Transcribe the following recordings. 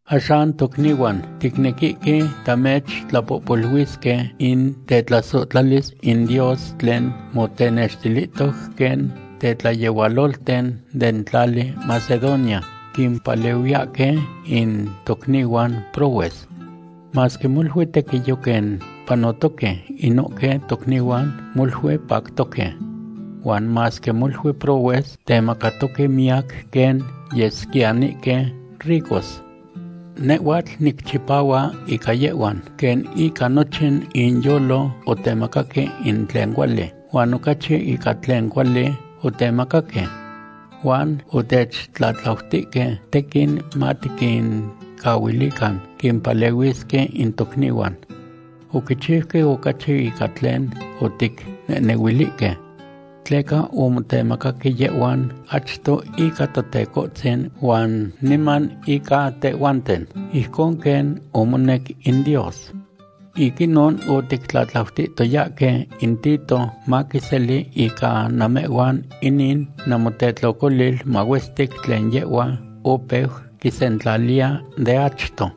Axan tocnihuan, ticnequihque tamechtlapohuilisque in tetlasohtlalis in Dios tlen motenextilihtoc quen tetlayehualolten den tlali Macedonia quimpalehuiyahque in tocnihuan prohues. Masque molui tequiyo quen panotoque inohque tocnihuan, molui pactoque. Huan masque molui prohues, temacatoque miyac quen yesquiyanihque ricos. Nehhuatl nicchipahua ica yehhuan, quen ica nochin inyolo otemacaque in tlen cuali, huan ocachi ica tlen cuali otemacaque. Huan otechtlatlautihque tequin matiquincahuilican quimpalehuisque in tocnihuan. Oquichiuque ocachi ica tlen oticnehnehuilihque. Tleca omotemacaque yehhuan achto ica Totecohtzin huan niman ica tehhuanten, ijcon quen omonec in Dios. Ic inon otictlatlautihtoyahque in Tito maquiseli ica namehhuan inin namotetlocolil mahuestic tlen yehhua opeu quisentlaliya de achto.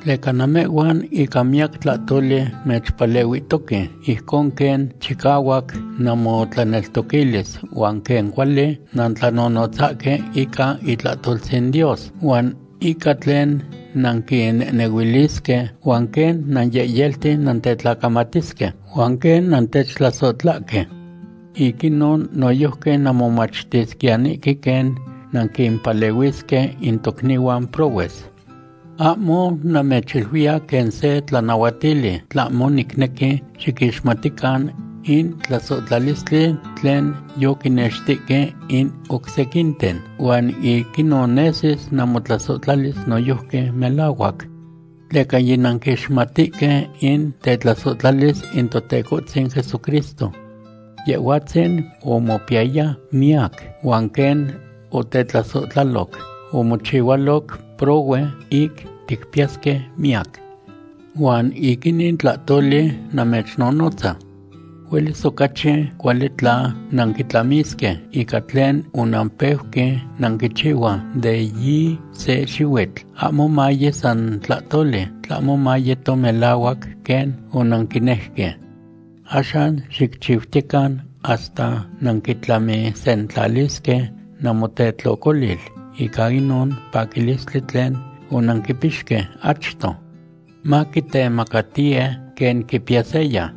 Tleca namehhuan ica miyac tlahtoli mechpalehuihtoque, ijcon quen chicahuac namotlaneltoquilis, huan quen cuali nantlanonotzasque ica itlahtoltzin Dios, huan ica tlen nanquinehnehuilisque, huan quen nanyehyelti tetlacamatisque, huan quen nantechtlasohtlahque. Ic inon noyojqui nanmomachtisquiyanihque quen nanquimpalehuisque in tocnihuan prohues. Ahmo namechiluiya quen se tlanahuatili, tlahmo nicnequi xiquixmatican in tlasohtlalistli tlen yoquinextihque in oc sequinten, huan ic inon nesis namotlasohtlalis noyojqui melahuac. Tleca yinanquixmatihque in tetlasohtlalis in Totecohtzin Jesucristo. Yehhuatzin omopiyaya miyac, huan quen otechtlasohtlaloc, omochihualoc prohue ic ticpiyasque miyac. Huan ic inin tlahtoli namechnonotza. Huelis ocachi cuali tla nanquitlamisque ica tlen onanpeuque nanquichihua de yi se xihuitl, ahmo maye san tlahtoli, tlahmo mayeto melahuac quen onanquinejque. Axan xicchiutiyecan hasta nanquitlamisentlalisque namotetlocolil ica inon paquilistli tlen onanquipixque achto. Maquitemacatiye quen quipiya seya.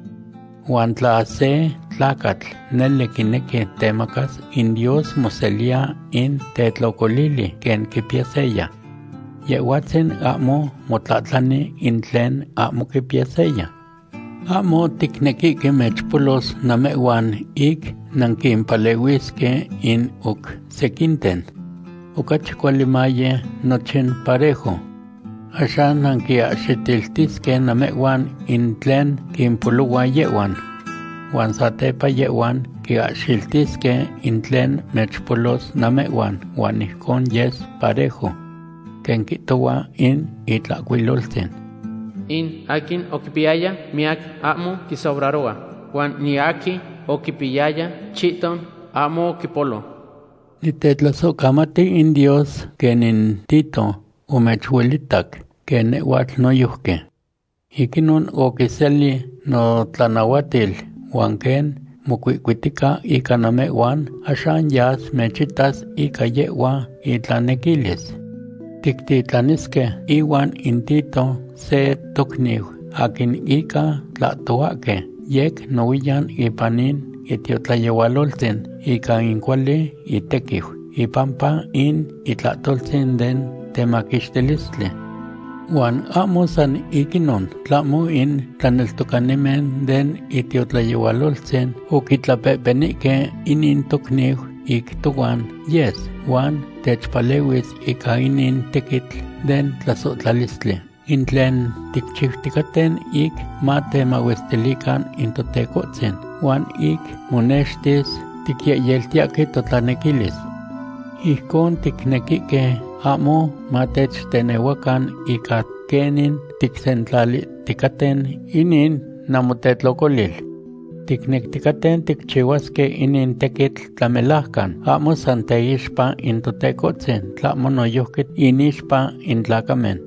Huan tla se tlacatl nele quinequi temacas, in Dios moseliya in tetlocolili quen quipiya seya. Yehhuatzin ahmo motlahtlani in tlen ahmo quipiya seya. Ahmo ticnequihque mechpolos namehhuan ic nanquimpalehuisque in oc sequinten. Ocachi cuali maye nochin parejo. Axan nanquiahxiltisque namehhuan in tlen quimpolohua yehhuan. Huan satepa yehhuan cahxiltisque in tlen mechpolos namehhuan huan ijcon yes parejo. Quen quihtohua in Itlahcuiloltzin: “In aquin oquipiyaya miyac ahmo quisobraro. Huan in aquin oquipiyaya chihton ahmo oquipolo.” Nitetlasohcamati in Dios, quen in Tito omechuelitac quen nehhuatl noyojqui. Ic inon oquiseli notlanahuatil, huan quen mocuihcuitica ica namehhuan, axan yas mechitas ica yehhua itlanequilis. Tictitlanisque ihuan in Tito se tocniu aquin ica tlahtohuahque yec nohuiyan ipan in itiotlayehualoltzin ica in cuali itequiu ipampa in itlahtoltzin den temaquixtilistli. Huan ahmo san ic inon, tlahmo in tlaneltocanimen den itiotlayehualoltzin oquitlapehpenihque inin tocniu ic tohuan yes huan techpalehuis ica inin tequitl den tlasohtlalistli, in tlen ticchiuticaten ic matemahuestilican in Totecohtzin huan ic monextis ticyehyeltiyahque totlanequilis. Ijcon ticnequihque ahmo matechtenehuacan ica quenin ticsentlalihticaten inin namotetlocolil. Ticnecticaten ticchihuasque inin tequitl tlamelajcan, ahmo san teixpa in Totecohtzin, tlahmo noyojqui inixpa in tlacamen.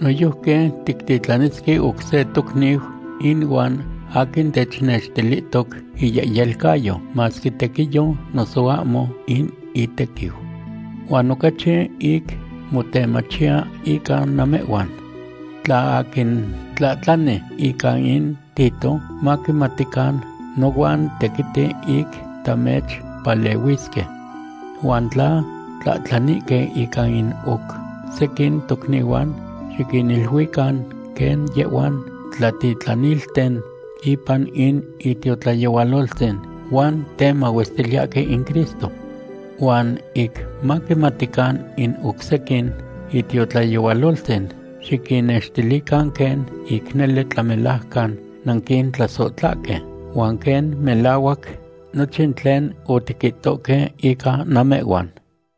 Noyojqui tictitlanisque oc se tocniu inuan, aquin technextilihtoc iyehyelcayo, masque tequiyo noso ahmo in itequiu. Huan ocachi ic motemachiya ica namehhuan. Tla aquin tlahtlani ica in Tito, maquimatican nohuan tequiti ic tamechpalehuisque. Huan tla tlahtlanihque ica in oc sequin tocnihuan, xiquiniluican quen yehhuan tlatitlanilten ipan in itiotlayehualoltzin huan temahuestiliyahque in Cristo. Huan ic maquimatican in oc sequin itiotlayehualoltzin, xiquinnextilican quen ic nele tlamelajcan nanquintlasohtlahque, huan quen melahuac nochin tlen otiquihtoque ica namehhuan.